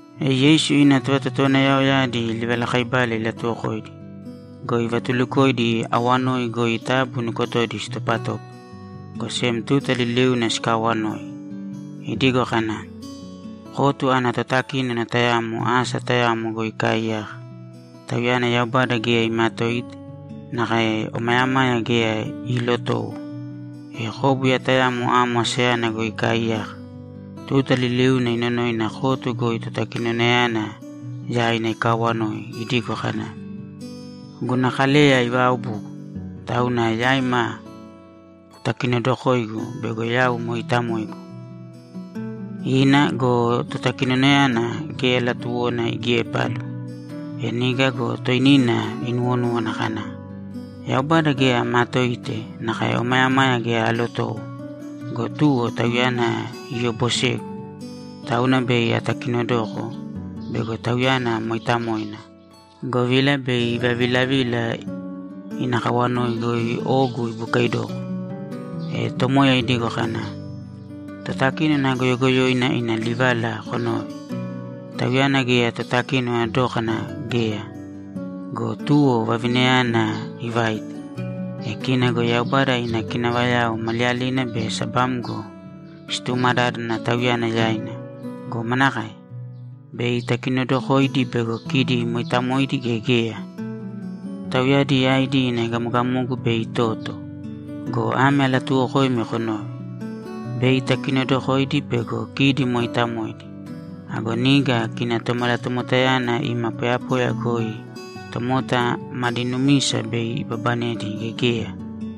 E Yeisu ina tovatotowanayaoyadi livalakaibala ilatuwokoidi go, ivatulukoidi awanoi goi taabu nukotodi sitopatōpa, go sem tuta liliuna sikaawanoi. Idigo kana, ‘Kotu ana totakínona tayamo asa tayamo goi ikaaiyaka. Tauyana Yaubada geya imaatoite nakae omayamaya geya iilotowo. E kóbuya tayamo amo asayana goi ikaaiyaka. Tuta liliuna inonoina kotu goi totakinonayana yaina ikaawanoi idigo kana, “Guna kaleya ivaaobugu, tauna yaima kutakinodokōigu bego yau mooitamoigu.” Ina go, totakinonayana geya latuwona igiepalu. E niga go toinina inuwonúwana kana, “Yaubada geya amaatoite nakae omayamaya geya aalotowo go, tuwo tauyana iyobosegu, tauna bei atakinodoko bego tauyana mooitamoina, govila bei ivavilavila ina kawanoi goi ogu ibukaidoko.”’ E Tomoya idigo kana, ‘Totakínona goyogoyoina ina livala konōve! Tauyana geya totakinona dókana geya go, tuwo vavinayana ivaite. E kina go Yaubada ina kinavayao maliyalina be sabamgo situmadádana Tauyana yaina go, manakae? Bei itakinodokoidi bego kidi mooitamoidi gea geya? Tauyadi yaidi ina egamogamogu bei itoto go, ame alatuuwokoimi konōve: Bei itakinodokoidi bego kidi mooitamoidi. Ago niga kina Tomalatomotayana ima poyapoya goi tomota madi numisa bei ibabanedi gea geya?’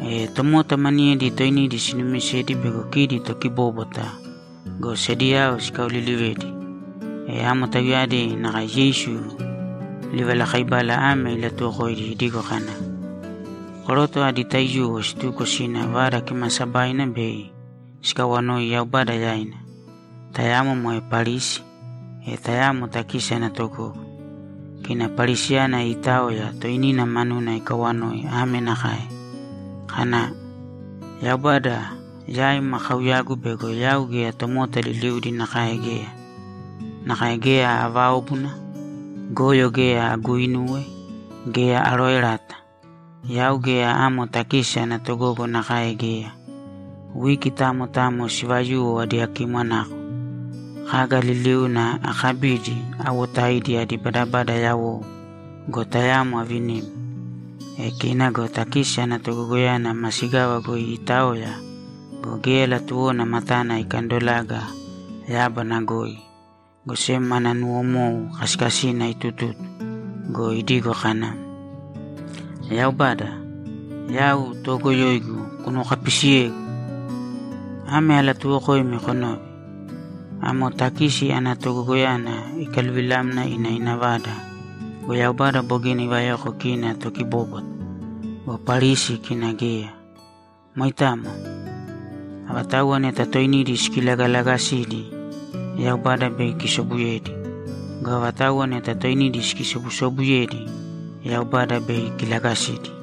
E tomota maniyedi toinidi sinumisedi bego kidi tokibóbwata go, sediyao sikaolilivedi. E amo tauyadi nakae Yeisu livalakaibala ame ilatuwokoidi idigo kana, ‘Koroto adi taiyuwo situko sina Vada Kimaasabaina bei sikawanoi Yaubada yaina. Tayamo moe Parisi, e tayamo takisi ana togogo. Kina Parisiyana iitaoya, toinina manuna ikawanoi ame nakae: Kana, “Yaubada, yaim akauyagu bego yau geya tomota liliudi nakae geya. Nakae geya aaváobuna, goyo geya aguuinuwe, geya arooerata. Yau geya amo takisi ana togogo nakae geya. Wiki tamo tamo sivayuwo adiyakimwanako. Kaga liliuna akabidi, awotaidi adi badabada yawou go, tayamo avinim.” E kina go takisi ana togogoyana masigava goi iitaoya go, geya latuwona matana ikandolaga yábana goi, go sem mana nuwomou kasikasina itututu go, idigo kana, “Yaubada, yau toogoyoigu kunuwokapisiyēgu!” Ame alatuuwokoimi konōve: Amo takisi ana togogoyana ikaluvilamna ina ina vada go, Yaubada bogina ivayoko kina tokibóbwata go, Parisi kina geya. Moitamo. Avatauwa neta toinidi sikilagalagasidi, Yaubada bei ikisobuyedi. Go avatauwa neta toinidi sikisobusobuyedi, Yaubada bei ikilagasidi.’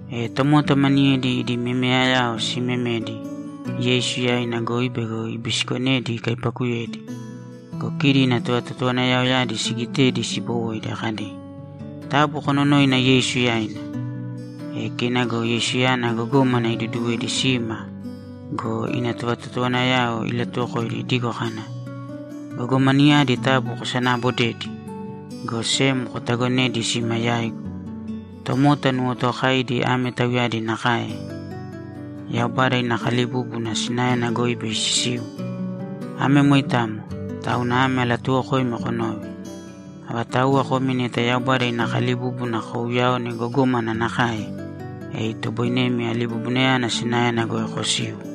E tomota maniyedi idi memeyayao siimemedi Yeisu yaina goi bego ibisikonedi ikaipakuyedi. Go kidi ina tovatotowanayaoyadi sigitedi sibowoidi kadi, ‘Taabu kononōina Yeisu yaina.’ E kina go Yeisuyana gogómana iduduwedi sima go, ina tovatotowanayao ilatuwokoidi idigo kana, ‘Gogomanayadi taabu kosanaabodēdi, go sem kotagonēdi sima yaigu. Tomota nuwotookaidi ame tauyadi nakae Yaubada ina kalibúbuna sinaena goi bei sisiu. Ame moitamo, tauna ame alatuuwokoimi konōve: Avatauwa komi neta Yaubada ina kalibúbuna kouyaone gogómana nakae, e itoboinemi alibubunayana sinaena goi kosiu.’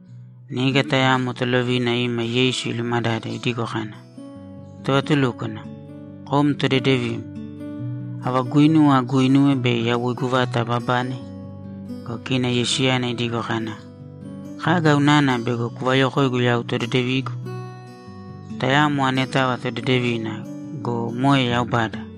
Niga tayamo tolovina ima Yeisu ilumadade idigo kana, ‘Tovatulúkwana, kom todedevim. Ava guinuwa aguuinuwe bei yawoigu vata ababane?’ Go kina Yeisuyana idigo kana, ‘Kaga unana bego kuvayokoigu yau todedevigu? Tayamo anetava todedevina go, moe Yaubada!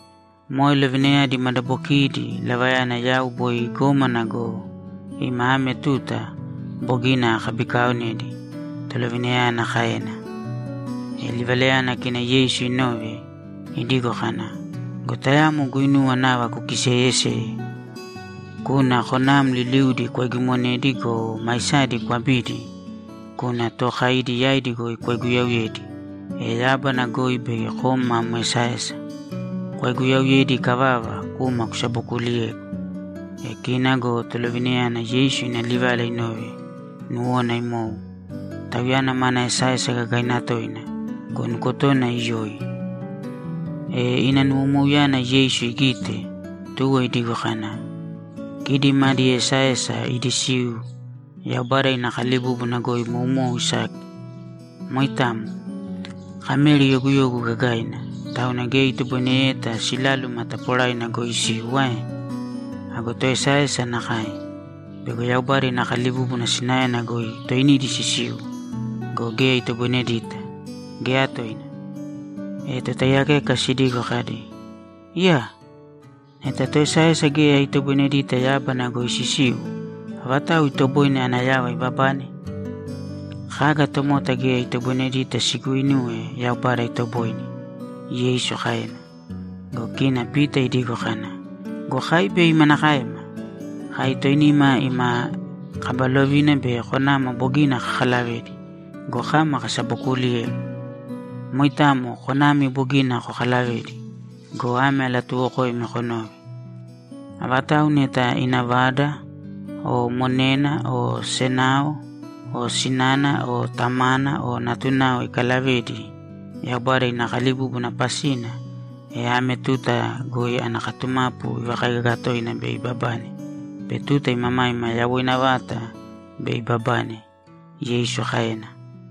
‘Moe lovinayadi madabokiidi lavayana yau boi gómana go, ima ame tuta, bogina akabikaaonedi’, tolovinayana kaena. E livalayana kina Yeisu inove, idigo kana, ‘Go tayamo guinuwa nava kukiseeyeseye. Kūna konam liliudi kwaigimonēdi go, maisadi kwabīdi, kūna tookaidi yaidi goi kwaiguyauyēdi, e yábana goi bei kom mam esaesa. Kwaiguyauyedi ikavava, kūma kusabokuuliyēgu.’ E kina go tolovinayana Yeisu ina livala inove, nuwona imou. Tauyana mana esaesa gagaina toina go, nukotona iyoi. E ina nuwomouyana Yeisu igite, tuwo idigo kana, ‘Kidi madi esaesa idi siu Yaubada ina kalibúbuna goi moumou isaki. Moitamo. Kameri yoguyogu gagaina, tauna geya itoboineyeta siláluma taporaina goi isiu ae? Ago toesaesa nakae. Bego Yaubada ina kalibúbuna sinaena goi toinidi sisiu go, geya itoboinedita, geya toina.’ E totaiyakeka sidigo kadi, ‘Iyaa! Neta toesaesa geya itoboinedita yábana goi sisiu, avatau itoboine ana yava ibabane?’ ‘Kaga tomota geya itoboinedita siguuinuwe Yaubada itoboine’, Yeisu kaena. Go kina Pita idigo kana, ‘Go kai bei manakaema? Kai toinima ima kaba lovina be konama bogina kakalavedi go, kama kasabokuuliyem.’ ‘Moitamo konami bogina kokalavedi go, ame alatuuwokoimi konōve: Avatau neta ina vada o monena o senao o sinana o tamana o natunao ikalavedi Yaubada ina kalibúbuna pasina, e ame tuta goi ana katumapu ivakaigaga toina bei ibabane be tuta imamaima yawoina vata bei ibabane’, Yeisu kaena.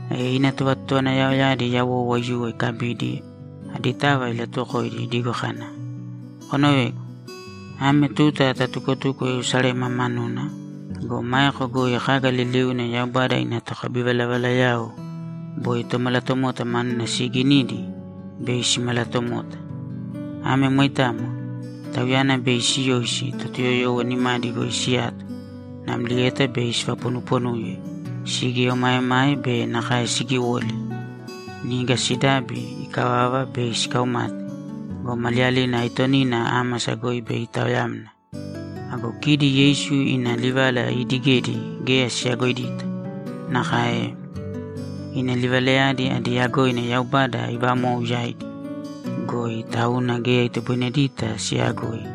E ina tovatotowanayaoyadi yawou aiyuwo ikabidi, aditava ilatuwokoidi idigo kana, ‘Konovēgu. Ame tuta tatukotuko Yerusalema manuna go, maeko goi kaga liliuna Yaubada ina tokabivalavalayao boi Tomalatomota manuna siiginidi bei simalatomota. Ame moitamo. Tauyana bei siyoisi Totuyoyowo nimadi goi siyato, namlieta bei sivaponuponuye, sigieomaemae be nakae sigiwoli. Niga sidabi ikavava, bei sikaumate go, maliyalina aitonina ámasa goi bei itaoyamna.’ Ago kidi Yeisu ina livala iidigedi geya siyagoidita. Nakae ina livalayadi adi yagoina Yaubada ivamou yaidi goi, tauna geya itoboinedita siyagoi.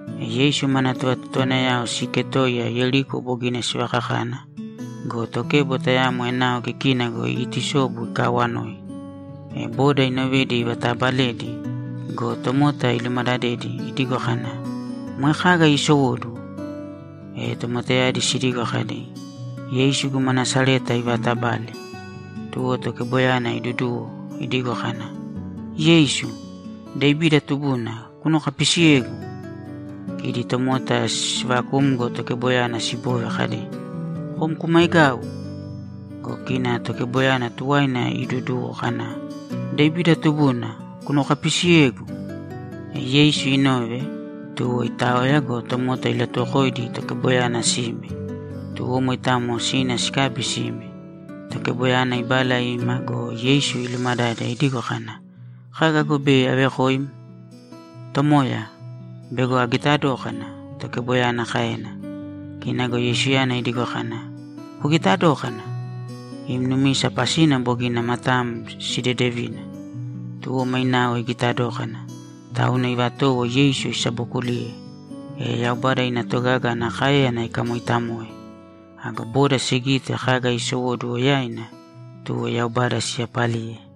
E Yeisu mana tovatotowanayao siiketoiya Yeriko bogina sivakakana go, tokebo tayamo enao kikina goi iitusobu ikaawanoi. E boda inovedi ivataabaledi go, tomota ilumadadedi idigo kana, ‘Moe kaga iisowóduwo?’ E tomotayadi sidigo kadi, ‘Yeisu guma Nasareta ivaatabale.’ Tuwo tokeboyana iiduduwo, idigo kana, ‘Yeisu, Devida tubuna, kunuwokapisiyēgu!’ Kidi tomota siivakumgo tokeboyana siboove kadi, ‘Kom kumaigāu!’ Go kina tokeboyana tuwaina iiduduwo kana, ‘Devida tubuna, kunuwokapisiyēgu!’ E Yeisu inove, tuwo itaoya go, tomota ilatuwokoidi tokeboyana sime. Tuwo moitamo sina sikabi sime. Tokeboyana ibala ima go, Yeisu ilumadade idigo kana, ‘Kaga go bei avekoim?’ ‘Tomoya, bego agita dókana’, tokeboyana kaena. Kina go Yeisuyana idigo kana, ‘Kugita dōkana! Im numisa pasina bogina matam sidedevina.’ Tuwo mainao igita dókana, tauna ivatowo Yeisu isabokuliye, e Yaubada ina togaga ana káeyana ikamooitamoe. Ago boda sigite kaga iisowóduwo yaina, tuwo Yaubada siyapaliye.